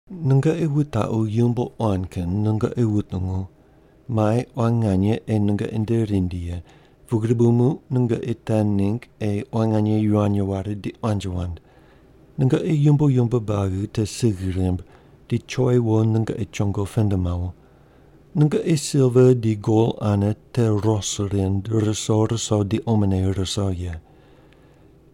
Nungoqi wutaqu yumbo quan kin nungoqi wutungu. Mai quan nganye ei nungoqi nde rindi ye, pugri bu muq nungoqi te ningg ei quan nganye yivany ware di quanji wand. Nungoqi yumbo yumbo buagi te sigh rimb di choi wo nungoqi chongo pend mawo. Nungoqi silva di gol ane te ros rind ruso ruso di omone ruso ye.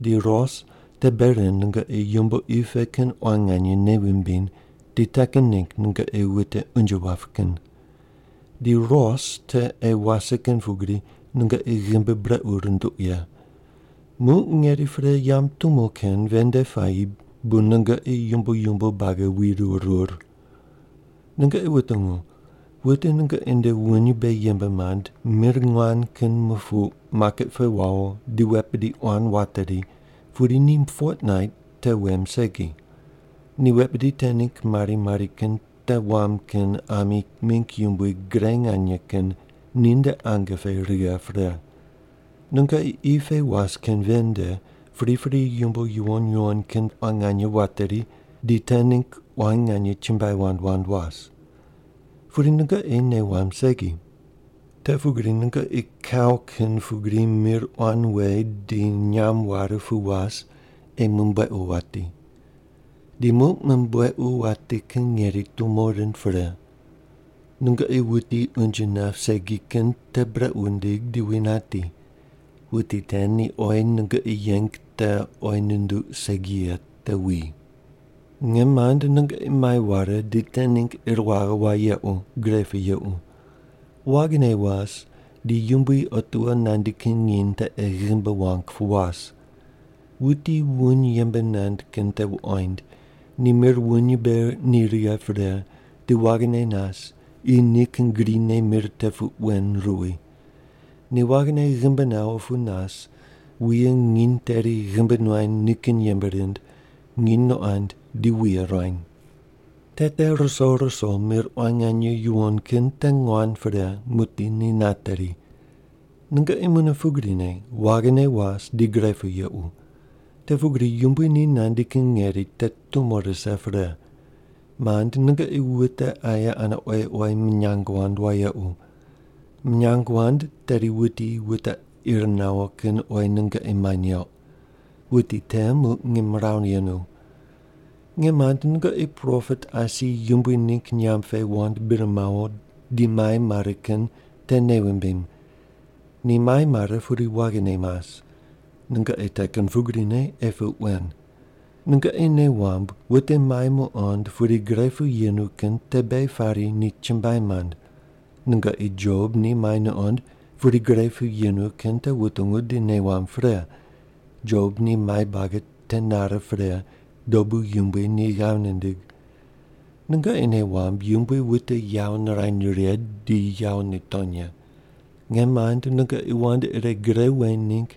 Di ros te bei rind nungoqi yumbo qi pe kin quan nganye nei wumbiny di te kin ningg nungoqi wute unje wap kin. Di ros te ei wase kin pugri nungoqi ghimbi brequ runduq ye. Muq ngeri pre yamb tumo kin ven nde puayi bu nungoqi yumbo yumbo buagi wirur rur. Nungoqi wutungu. Wute nungoqi nde wuny mbe yembe mand mir nguan kin mupuq maket pe wawo di wet bidi quan wateri pudi ni fotnait te wem segi. Ni wet bidi te ningg mari mari kin te wam kin ami mingg yumbui gre nganye kin ninde ange pe righe pre. Nungoqi qi pe was kin ven nde pripri yumbo yuwon yuwon kin quan nganye wateri di te ningg quan nganye chumbuai wand wand was. Pudi nungoqi nei wamb segi. Te pugri nungoqi kau kin pugri mir quan we di nyam ware pu was ei mumbuequ wati. Di muq mumbuequ wati kin ngeri tumo rind pre. Nungoqi wuti unje nap segi kin te brequ wundig di wi nati. Wuti te ni oyi nungoqi yeng te oyi nunduq segi ye te wi. Nge mand, nungoqi mai ware di te ningg ir waghe wayequ, gre pu yequ. Waghine was di Yumbui otiwo nandi kin nginy te ei ghimbi wang pu was. Wuti wuny yembe nand kin te wuqoind, ni mir wuny mbe ni righe pre di waghine nas qi nikin grine mir te puq wen ruwi. Ni waghine ghimbi nawo pu nas wuye nginy teri ghimbi nuany nikin yembe rind, nginy nuqond di wuye ruany. Te te ruso ruso mir quan nganye yuwon kin te nguan pre muqdi ni nateri. Nungoqi mune pugrine, waghine was di gre pu yequ. Te pugri Yumbui ni nandi kin ngeri te tumo rise pre. Mand, nungoqi wute aye ane oyi oyi minyang wand wayequ. Minyang wand tedi wuti wute ir nawo kin oyi nungoqi mai neuq. Wuti te muq ngimrawu yenu. Nge mand, nungoqi propet asi Yumbui ningg nyamb pe wand bir mawo di mai mare kin te nei wumbim. Ni mai mare pudi waghine mas. Nungoqi te kin pugrine ei puq wen. Nungoqi nei wamb wute mai muqond pudi gre pu yemu kin te beghi pari ni chumbuai mand. Nungoqi Job ni mai nuqond pudi gre pu yenu kin te wutungu di nei wamb pre. Job ni mai buagi te nare pre dobu Yumbui ni ghav nindig. Nungoqi nei wamb, Yumbui wute yawo nirany righe di yawo nitony ye. Nge mand nungoqi wand ire gre weny ningg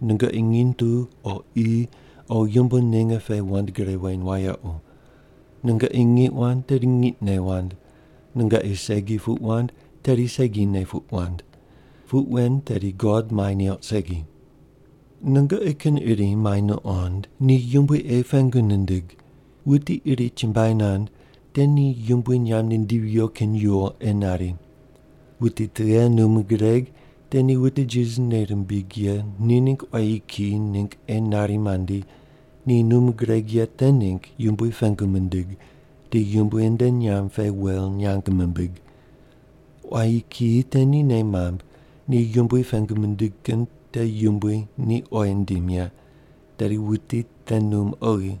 nungoqi nginy tu o qi o yumbo ninge pe wand gre weny wayequ. Nungoqi ngiq wand tedi ngiqne wand. Nungoqi segi puq wand tedi segi ne puq wand. Puq wen tedi God mai neuq segi. Nungoqi kin iri mai nuqond, ni Yumbui ei pengu nindig. Wuti iri chumbuai nand te ni Yumbui nyamb nindivi viyo kin yuwo ei nari. Wuti tughe num gureg te ni wute Jisas nei rimbig ye ni ningg quayi kiyi ningg ei nari mandi, ni num gureg ye te ningg Yumbui pengu mindig, di Yumbui nde nyamb pe wel nyang mimbig. Quayi kiyi te ni nei mamb ni Yumbui pengu mindig kin te Yumbui ni oyi nindim ye, tedi wuti te num oghi.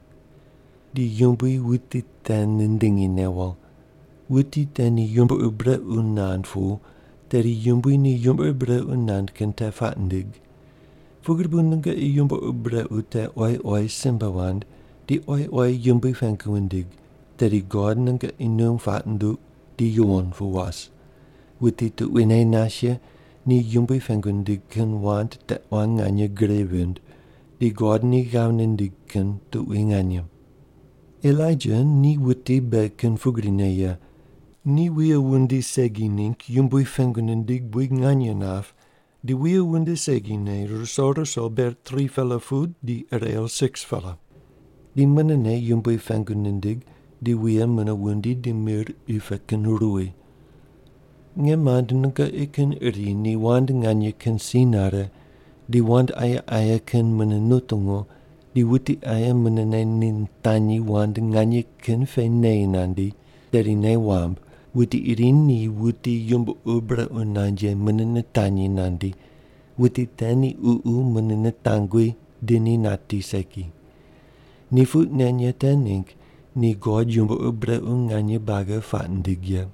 Di Yumbui wuti te nindingi newo. Wuti te ni yumbo ur brequ nand pu tedi Yumbui ni yumbo ur brequ nand kin te puaq nindig. Pugri bu nungoqi yumbo ur brequ te oyi oyi simbe wand, di oyi oyi Yumbui pengu wundig tedi God nungoqi num puaq nunduq di yuwon pu was. Wuti tuquine nas ye ni Yumbui pengu nindig kin wand te quan nganye gre vind, di God ni ghav nindig kin tuqui nganye. Elaija ni wuti beghi kin pugrine ye. Ni wuye wundi segi ningg Yumbui pengu nindig buid nganye nap di wuye wundi segine ruso ruso ber 3-pela pu di irew 6-pela. Di munene Yumbui pengu nindig di wuye mune wundi di mir qi pe kin ruwi. Nge mand, nungoqi kin iri ni wand nganye kin si nare di wand aye aye kin mune nutungu di wuti aye munene ni nitanyi wand nganye kin pe neyi nandi, tedi nei wamb: Wuti iri ni wuti yumbo ur brequ nand ye mune nitanyi nandi, wuti te ni ququ mune nitangwi di ni nati segi. Ni puq nen ye te ningg di God yumbo ur brequ nganye buagi puaq nindig ye.